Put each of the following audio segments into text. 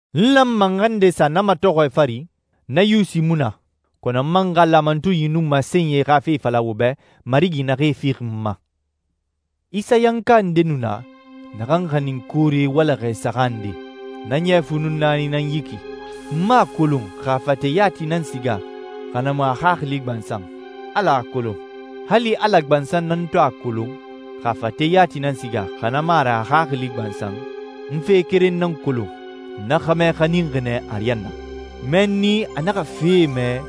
N lanma n xa nde sa na matɔxɔɛ fari? Na yusi mu na, kɔnɔ n man xa laamatunyie nun masenyie xa fe fala wo bɛ Marigi naxee fixi n ma. Isayanka nde nu na, naxan xanin koore walaxɛ saxan nde. Na ɲɛ fu nun naani nan yi ki. N mu a kolon xa a fate yati nan siga, xa na mu a xaxili gbansan. Ala a kolon. Hali Ala gbansan nan to a kolon, xa a fate yati nan siga, xa na mu a ra a xaxili gbansan, n fe keren nan kolon, na xɛmɛ xaninxi nɛ ariyanna. Mɛnni a naxa fee mɛ,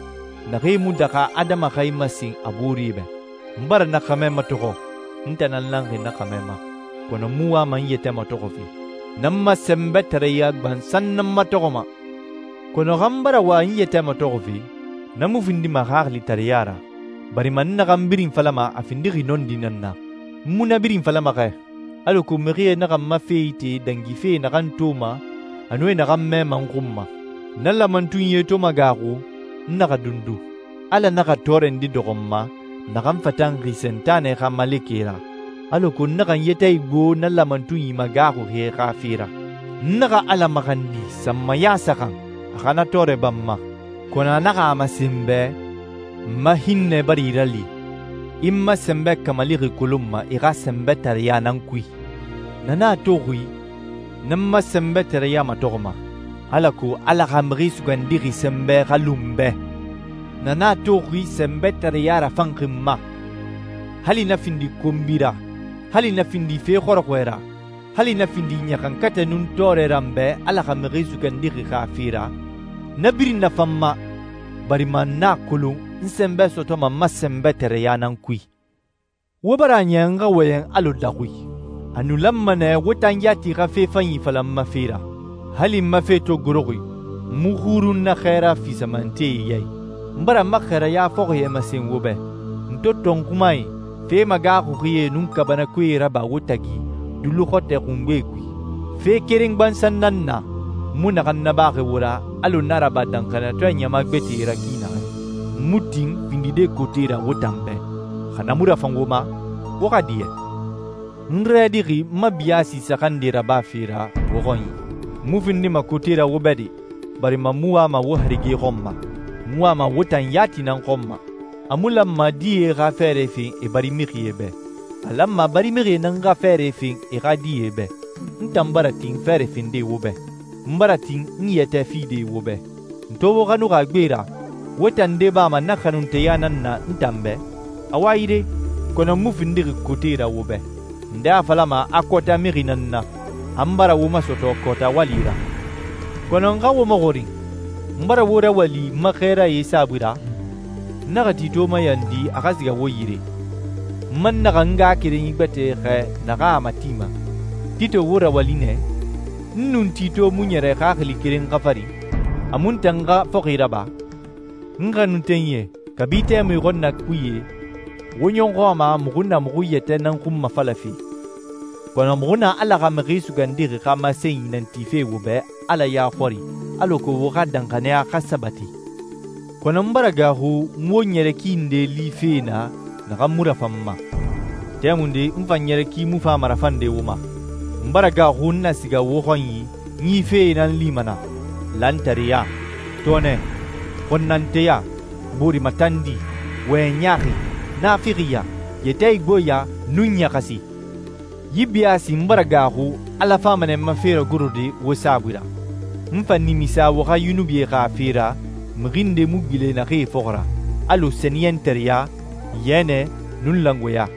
naxee mu daxa adama xa e masen a boore bɛ. N bara na xɛmɛ matɔxɔ. N tan nan lanxi na xɛmɛ ma, kɔnɔ n mu wama n yɛtɛ matɔxɔfe. N nan n ma sɛnbɛtareya gbansan nan matɔxɔma. Kɔnɔ xa n bara wa n yɛtɛ matɔxɔfe, na mu findima xaxilitareɲa ra, barima n naxan birin falama a findixi nɔndi nan na. N mu na birin falama xɛ, alako mixie naxa n ma fe ite dangife e naxan toma a nun e naxan mɛma n xun ma. Na laamatunyie to magaaxu, n naxa dundu. Ala naxa tɔɔrɛ nde dɔxɔ n ma, naxan fatanxi Sentanɛ xa malekɛ ra, alako n naxa n yɛtɛ igbo na laamatunyi magaaxuxie xa fe ra. N naxa Ala maxandi sanmaya saxan a xa na tɔɔrɛ ba n ma, kɔnɔ a naxa a masen n bɛ, «N ma hinnɛ bara i rali. I n ma sɛnbɛ kamalixi kolonma i xa sɛnbɛtareya nan kui.» Na nan a toxi n nan n ma sɛnbɛtareya matɔxɔma, alako Ala xa Mixi Sugandixi sɛnbɛ xa lu n bɛ. Na nan a toxi sɛnbɛtareya rafanxi n ma. Hali na findi konbi ra, hali na findi fe xɔrɔxɔɛ ra, hali na findi ɲaxankatɛ nun tɔɔrɛ ra n bɛ Ala xa Mixi Sugandixi xa fe ra, na birin nafan n ma, barima n a kolon n sɛnbɛ sɔtɔma n ma sɛnbɛtareya nan kui. Wo bara a niya n xa wɔyɛn alɔ daxui. A nu lanma nɛ wo tan yati xa fe fanyi fala n ma fe ra. Hali n ma fe to goroxi, n mu xurun na xɛɛra fisamantee ya i. N bara n ma xɛɛraya fɔxie masen wo bɛ, n to tɔnxumae, fe magaaxuxie, nun kaabanakoe raba wo tagi duluxɔtɔɛ xungbe kui. Fe keren gbansan nan na, n mu naxan nabaxi wo ra alɔ n a raba danxaniyatɔɛ ɲama gbɛtɛe ra ki naxɛ. N mu tin findide kote ra wo tan bɛ. Xa na mu rafan wo ma, wo xa diɲɛ. N rɛdixi n ma biyaasi saxan nde rabafe ra wo xɔnyi. N mu findima kote ra wo bɛ de, barima n mu wama wo harige xɔn ma. N wama wo tan yati nan xɔn ma. A mu lanma die xa fɛɛrɛ fen e barimixie bɛ. A lanma barimixie nan xa fɛɛrɛ fen e xa die bɛ. N tan bara tin fɛɛrɛ fende wo bɛ. N bara tin n yɛtɛ fide wo bɛ. N to wo xanuxi a gbe ra, wo tan nde bama na xanunteya nan na n tan bɛ? Awa yire, kɔnɔ n mu findixi kote ra wo bɛ. Nde a falama a kɔɔta mixi nan n na, a n bara wo masɔtɔ kɔɔta wali ra. Kɔnɔ n xa wo maxɔrin, n bara wo rawali n ma xɛɛrae saabui ra? N naxa Tito mayandi a xa siga wo yire. N man naxa n ngaxakerenyi gbɛtɛ xɛɛ naxan a matima. Tito wo rawali nɛ? N nun Tito mu ɲɛrɛ xaxili keren xa fari? A mu n tan xa fɔxi raba? N xanuntenyie, kabi tɛmui xɔnnakuye wo ɲɔxɔ a ma muxu na muxu yɛtɛ nan xunmafalafe, kɔnɔ muxu na Ala xa Mixi Sugandixi xa masenyi nan tife wo bɛ Ala ya xɔri alako wo xa danxaniya xa sabati. Kɔnɔ n bara gaaxu n wo ɲɛrɛ ki nde life naa naxan mu rafan n ma. Tɛmunde n fan ɲɛrɛ ki mu fama rafande wo ma. N bara gaaxu n na siga wo xɔnyi n yi fee nan lima naa: lantareya, tɔɔnɛ, xɔnnanteya, boore matandi, wɔyɛn ɲaaxi, naafixiya, yɛtɛ igboɲa, nun ɲaxasi. Yi biyaasi n bara gaaxu Ala fama nɛ n ma fe ragorode wo saabui ra, n fa nimisa wo xa yunubie xa fe ra, mixi ndee mu gbilen naxee fɔxɔ ra, alɔ sɛniyɛntareɲa, yɛnɛ, nun langoeɲa.